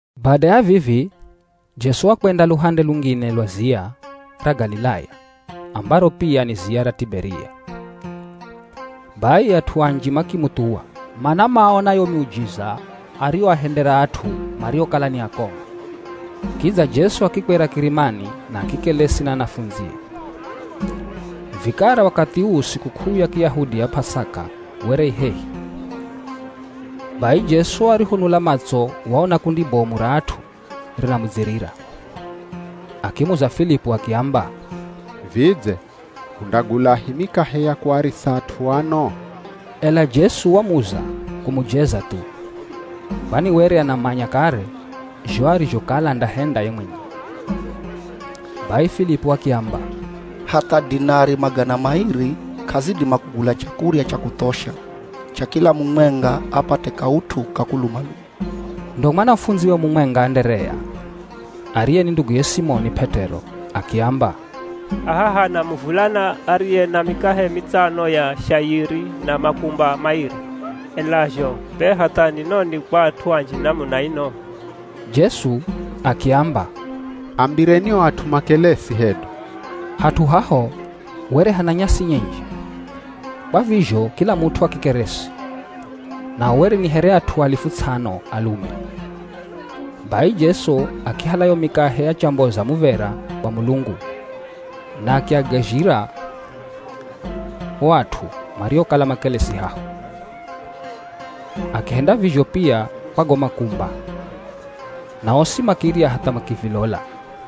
Bada ya vivi Jesu wakwenda luhande lungine lwa ziya ra Galilaya ambaro pia ni ziya ra Tiberia. Bai at'u anji makimuthuwa, mana maona yo miujiza ariyoahendera at'u mariokala ni akongo. Kidza Jesu akikwera kirimani na akikelesi na anafundzie. Vikara wakathi uu sikuk'uu ya Kiyahudi ya P'asaka were i hehi. Bai Jesu arihonula matso waona kundi bomu ra at'u rinamudzirira. Akimuza Filipu, akiamba, “Vidze hundagulahi mikahe ya kuarisa at'u ano?” Ela Jesu wamuza kumujeza thu, kwani were anamanya kare zho arizhokala andahenda ye mwenye. Bai Filipu akiamba, “Hatha dinari magana mairi k'azidima kugula chakurya cha kuthosha cha kila mumwenga apate kaut'u ka kuluma-luma.” Ndo mwanafundziwe mumwenga Anderea, ariye ni nduguye Simoni P'et'ero akiamba, “Haha hana muvulana ariye na mikahe mitsano ya shayiri na makumba mairi. Ela zho be hatha ni noni kwa at'u anji namuna ino?” Jesu akiamba, “Ambireni o at'u makelesi hedu.” Hat'u haho were hana nyasi nyinji. Kwa vizho kila mut'u akikeresi. Nao were ni here at'u alifu ts'ano, alume. Bai Jesu akihala yo mikahe achamboza muv̱era kwa Mulungu na akiagazhira o at'u mariokala makelesi haho. Akihenda vizho pia kwa go makumba, na osi makirya hatha makivilola.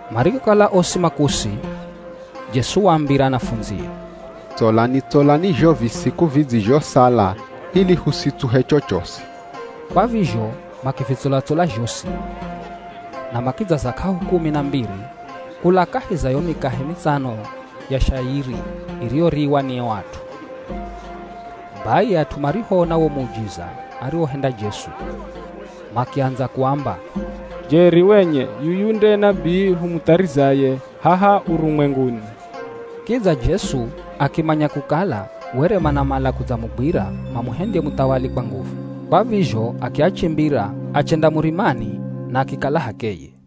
Marihokala osi makusi, Jesu waambira anafundzie, “Tsolani-tsolani zho visiku vidzizhosala ili husitsuhe chochosi.” Kwa vizho makivitsola-tsola zhosi, na makidzaza k'ahu kumi na mbiri kula kahi za yo mikahe mitsano ya shayiri iriyoriwa ni o at'u. Bai at'u marihoona wo muujiza ariwohenda Jesu makiandza kuamba, “Jeri wenye yuyu nde nabii humutharizaye haha urumwenguni.” Kidza Jesu akimanya kukala were manamala kudzamugwira mamuhendye muthawali kwa nguvu. Kwa vizho akiachimbira achenda murimani na akikala h'akeye.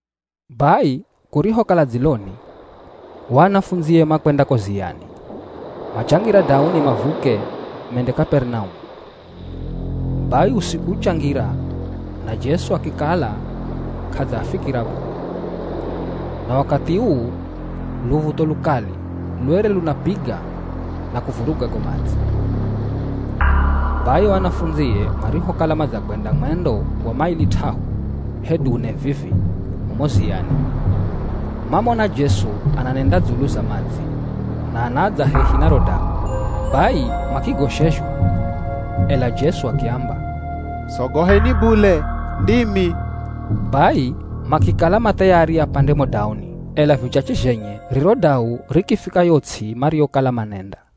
Bai kurihokala dziloni o anafundzie makwenda ko ziyani, machangira dauni mavuke mende Kaperinaumu. Bai usiku uchangira na Jesu akikala k'adzaafikira bule. Na wakathi uu luv̱utho lukali lwere lunapiga na kuvuruga go madzi. Bai o anafundzie marihokala madzakwenda mwendo wa maili t'ahu hedu ne vivi mumo ziyani, mamona Jesu ananenda dzulu za madzi na anadza hehi na ro dau, bai makigoshezhwa. Ela Jesu akiamba, “Sogoheni bule, ndimi.” Bai makikala ma thayari apande mo dauni, ela vichache zhenye riro dau rikifika yo ts'i mariyokala manenda.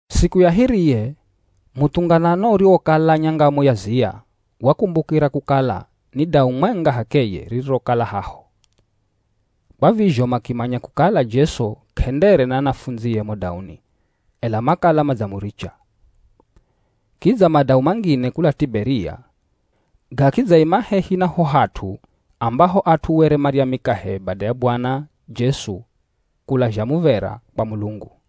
Siku ya hiriye muthunganano uriwokala nyangamo ya ziya wakumbukira kukala ni dau mwenga h'akeye ririrokala haho. Kwa vizho makimanya kukala Jesu k'endere na anafundzie mo dauni ela makala madzamuricha. Kidza madau mangine kula Tiberia gakidzaima hehi na ho hat'u ambaho at'u were marya mikahe bada ya Bwana Jesu kulazha muv̱era kwa Mulungu.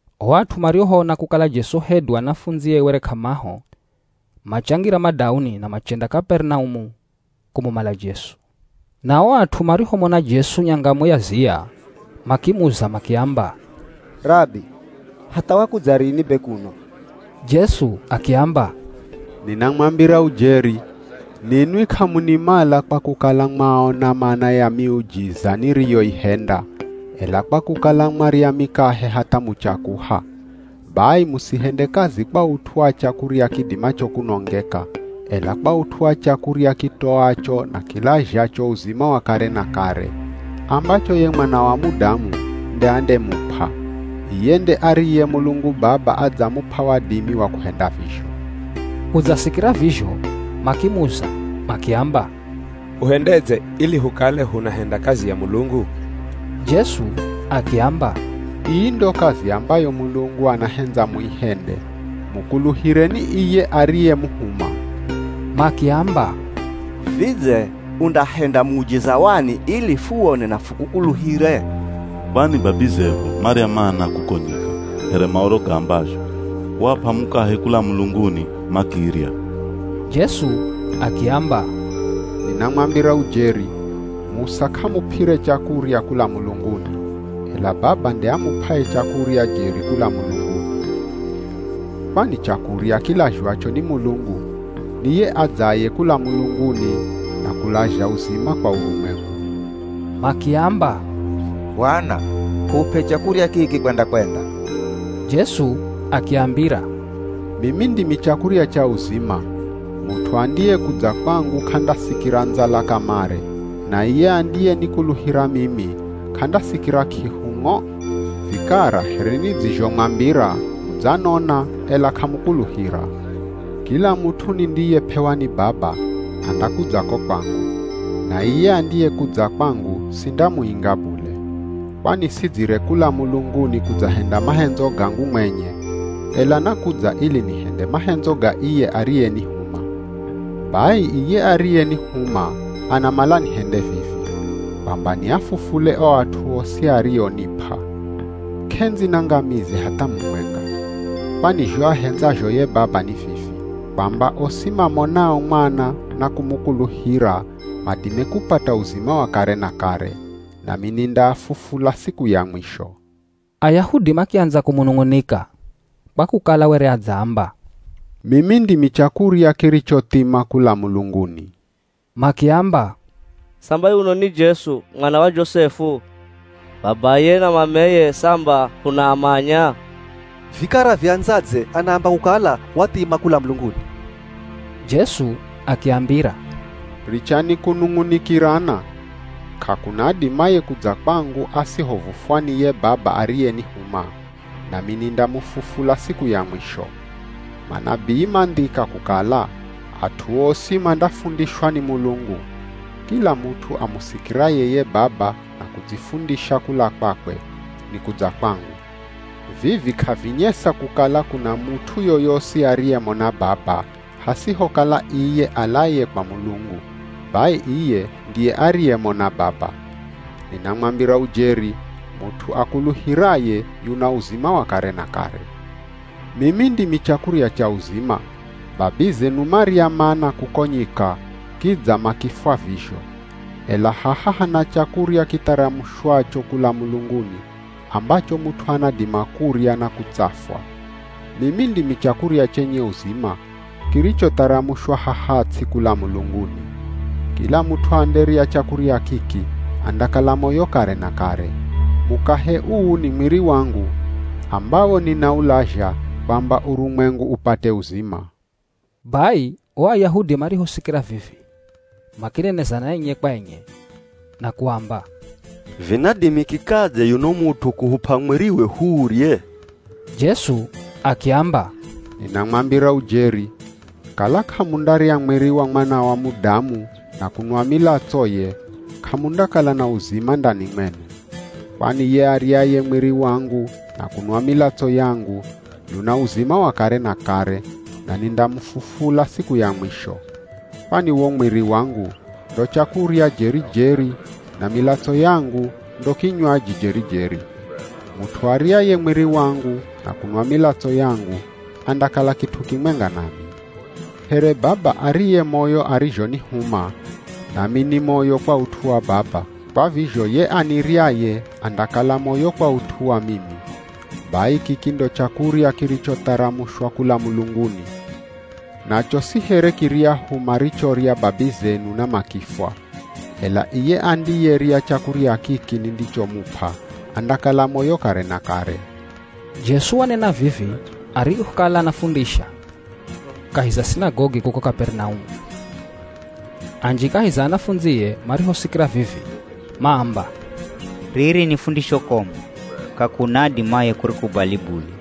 O at'u marihoona kukala Jesu hedu anafundzie were k'amaho, machangira madauni na machenda Kaperinaumu kumumala Jesu. Na o at'u marihomona Jesu nyangamo ya ziya makimuza makiamba, “Rabi, hatha wakudza rini be kuno?” Jesu akiamba, “Ninamwambira ujeri, ninwi k'amunimala kwa kukala mwaona mana ya miujiza niriyoihenda, ela kwa kukala mwarya mikahe hatha muchakuha. Bai musihende kazi kwa ut'u wa chakurya kidimacho kunongeka, ela kwa ut'u wa chakurya kitoacho na kilazhacho uzima wa kare na kare, ambacho ye Mwana wa Mudamu nde andemup'a. Iye nde ariye Mulungu Baba adzamup'a wadimi wa kuhenda vizho.” Kudzasikira vizho makimuza makiamba, “Huhendedze ili hukale hunahenda kazi ya Mulungu?” Jesu akiamba, “Ii ndo kazi ambayo Mulungu anahendza muihende, mukuluhireni iye ariyemuhuma.” Makiamba, “Vidze undahenda muujiza wani ili fuwone na fukukuluhire? Kwani babizehu marya Mana kuko nyika, here Maoro gaambazho, ‘Waap'a mukahe kula mulunguni makirya.’” Jesu akiamba, “Ninamwambira ujeri, Musa k'amup'ire chakurya kula mulunguni, ela Baba nde amup'aye chakurya jeri kula mulunguni. Kwani chakurya kilazhwacho ni Mulungu ni ye adzaye kula mulunguni na kulazha uzima kwa urumwengu.” Makiamba, “Bwana hup'e chakurya kiki kwenda-kwenda.” Jesu akiambira, “Mimi ndimi chakurya cha uzima. Mut'u andiyekudza kwangu k'andasikira ndzala kamare, na iye andiyenikuluhira mimi k'andasikira k'ihu ng'o. Vikara here nidzizhomwambira mudzanona, ela k'amukuluhira. Kila mut'u nindiyep'ewa ni Baba, andakudza ko kwangu, na iye andiyekudza kwangu sindamuinga bule. Kwani sidzire kula mulunguni kudzahenda mahendzo gangu mwenye, ela nakudza ili nihende mahendzo ga iye ariyenihuma. Bai iye ariyenihuma anamala nihende vivi: Kwamba niafufule o at'u osi arionip'a. K'endzi nangamize hatha mumwenga. Kwani zho ahendzazho ye Baba ni vivi: Kwamba osi mamonao Mwana na kumukuluhira madime kupata uzima wa kare na kare; nami nindaafufula siku ya mwisho.” Ayahudi makiandza kumunung'unika kwa kukala were adzaamba, “Mimi ndimi chakurya kirichothima kula mulunguni.” Makiamba, “Samba yuno ni Jesu, mwana wa Josefu? Babaye na mameye samba hunaamanya! Vikara viandzadze anaamba kukala wathima kula mulunguni?” Jesu akiambira, “Richani kunung'unikirana. K'akuna adimaye kudza kwangu asihovufwa ni ye Baba ariyenihuma, nami nindamufufula siku ya mwisho. Manabii mandhika kukala, ‘At'u osi mandafundishwa ni Mulungu.’ Kila mut'u amusikiraye ye Baba na kudzifundisha kula kwakwe, ni kudza kwangu. Vivi k'avinyesa kukala kuna mut'u yoyosi ariyemona Baba, hasihokala iye alaye kwa Mulungu, bai iye ndiye ariyemona Baba. Ninamwambira ujeri, mut'u akuluhiraye, yuna uzima wa kare na kare. Mimi ndimi chakurya cha uzima. Babizenu marya Mana kuko nyika, kidza makifwa vizho. Ela haha hana chakurya kitharamushwacho kula mulunguni ambacho mut'u anadima kurya na kutsafwa. Mimi ndimi chakurya chenye uzima kirichotharamushwa haha ts'i kula mulunguni. Kila mut'u anderya chakurya kiki andakala moyo kare na kare. Mukahe uu ni mwiri wangu, ambawo ninaulazha kwamba urumwengu upate uzima.” Bai o Ayahudi marihosikira vivi, makinenezana enye kwa enye na kuamba, “Vinadimikikadze yuno mut'u kuhup'a mwiriwe huurye?” Jesu akiamba, “Ninamwambira ujeri. Kala k'amundarya mwiri wa Mwana wa Mudamu na kunwa milatsoye k'amundakala na uzima ndani mwenu. Kwani ye aryaye mwiri wangu na kunwa milatso yangu yuna uzima wa kare na kare, na nindamufufula siku ya mwisho. Kwani wo mwiri wangu ndo chakurya jeri-jeri na milatso yangu ndo kinywaji jeri-jeri. Mut'u aryaye mwiri wangu na kunwa milatso yangu andakala kit'u kimwenga nami. Here Baba ariye moyo arizhonihuma, nami ni moyo kwa ut'u wa Baba, kwa vizho ye aniryaye andakala moyo kwa ut'u wa mimi. Bai kiki ndo chakurya kirichotharamushwa kula mulunguni. Nacho si here kiryahu marichorya babizenu na makifwa. Ela iye andiyerya chakurya kiki nindichomup'a, andakala moyo kare na kare.” Jesu wanena vivi arihokala anafundisha kahi za sinagogi kuko Kaperinaumu. Anji kahi za anafundzie marihosikira vivi maamba, “Riri ni fundisho komu, k'akuna adimaye kurikubali bule.”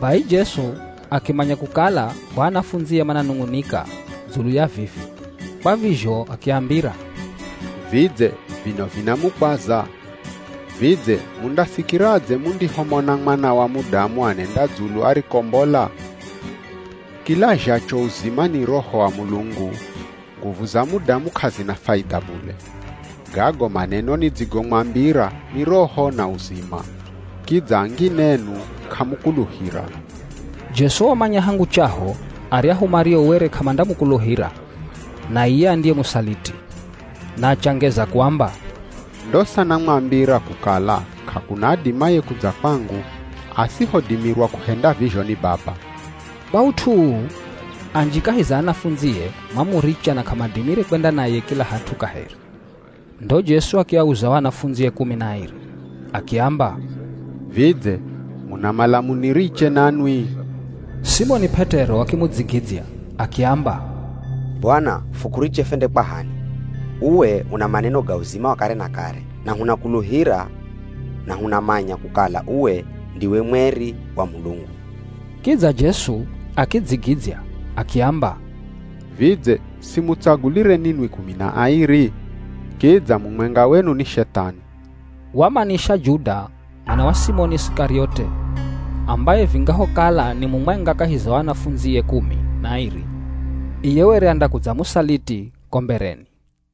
Bai Jesu akimanya kukala o anafundzie mananung'unika dzulu ya vivi, kwa vizho akiambira, “Vidze vino vinamukwaza? Vidze mundasikiradze mundihomona Mwana wa Mudamu anenda dzulu arikombola? Kilazhacho uzima ni Roho wa Mulungu, nguvu za mudamu k'azina faidha bule. Gago maneno nidzigomwambira ni Roho na uzima. Kidza angine enu k'amukuluhira!” Jesu wamanya hangu chaho aryahu mario were k'amandamukuluhira na iye andiyemusaliti. Na achangeza kuamba, “Ndosa namwambira kukala k'akuna adimaye kudza kwangu, asihodimirwa kuhenda vizho ni Baba.” Kwa ut'u uu, anji kahi za anafundzie mamuricha na k'amadimire kwenda naye kila hat'u kaheri. Ndo Jesu akiauza o anafundzie kumi na airi, akiamba, “Vidze munamala muniriche nanwi?” Simoni P'et'ero akimudzigidzya akiamba, “Bwana fukuriche fwende kwa h'ani? Uwe una maneno ga uzima wa kare na kare, na hunakuluhira na hunamanya kukala uwe ndiwe Mweri wa Mulungu.” Kidza Jesu akidzigidzya akiamba, “Vidze simutsagulire ninwi kumi na airi? Kidza mumwenga wenu ni Shethani!” Wamanisha Juda mwana wa Simoni Isikariote ambaye vingahokala ni mumwenga kahi za o anafundzie kumi na airi, iye were andakudzamusaliti ko mbereni.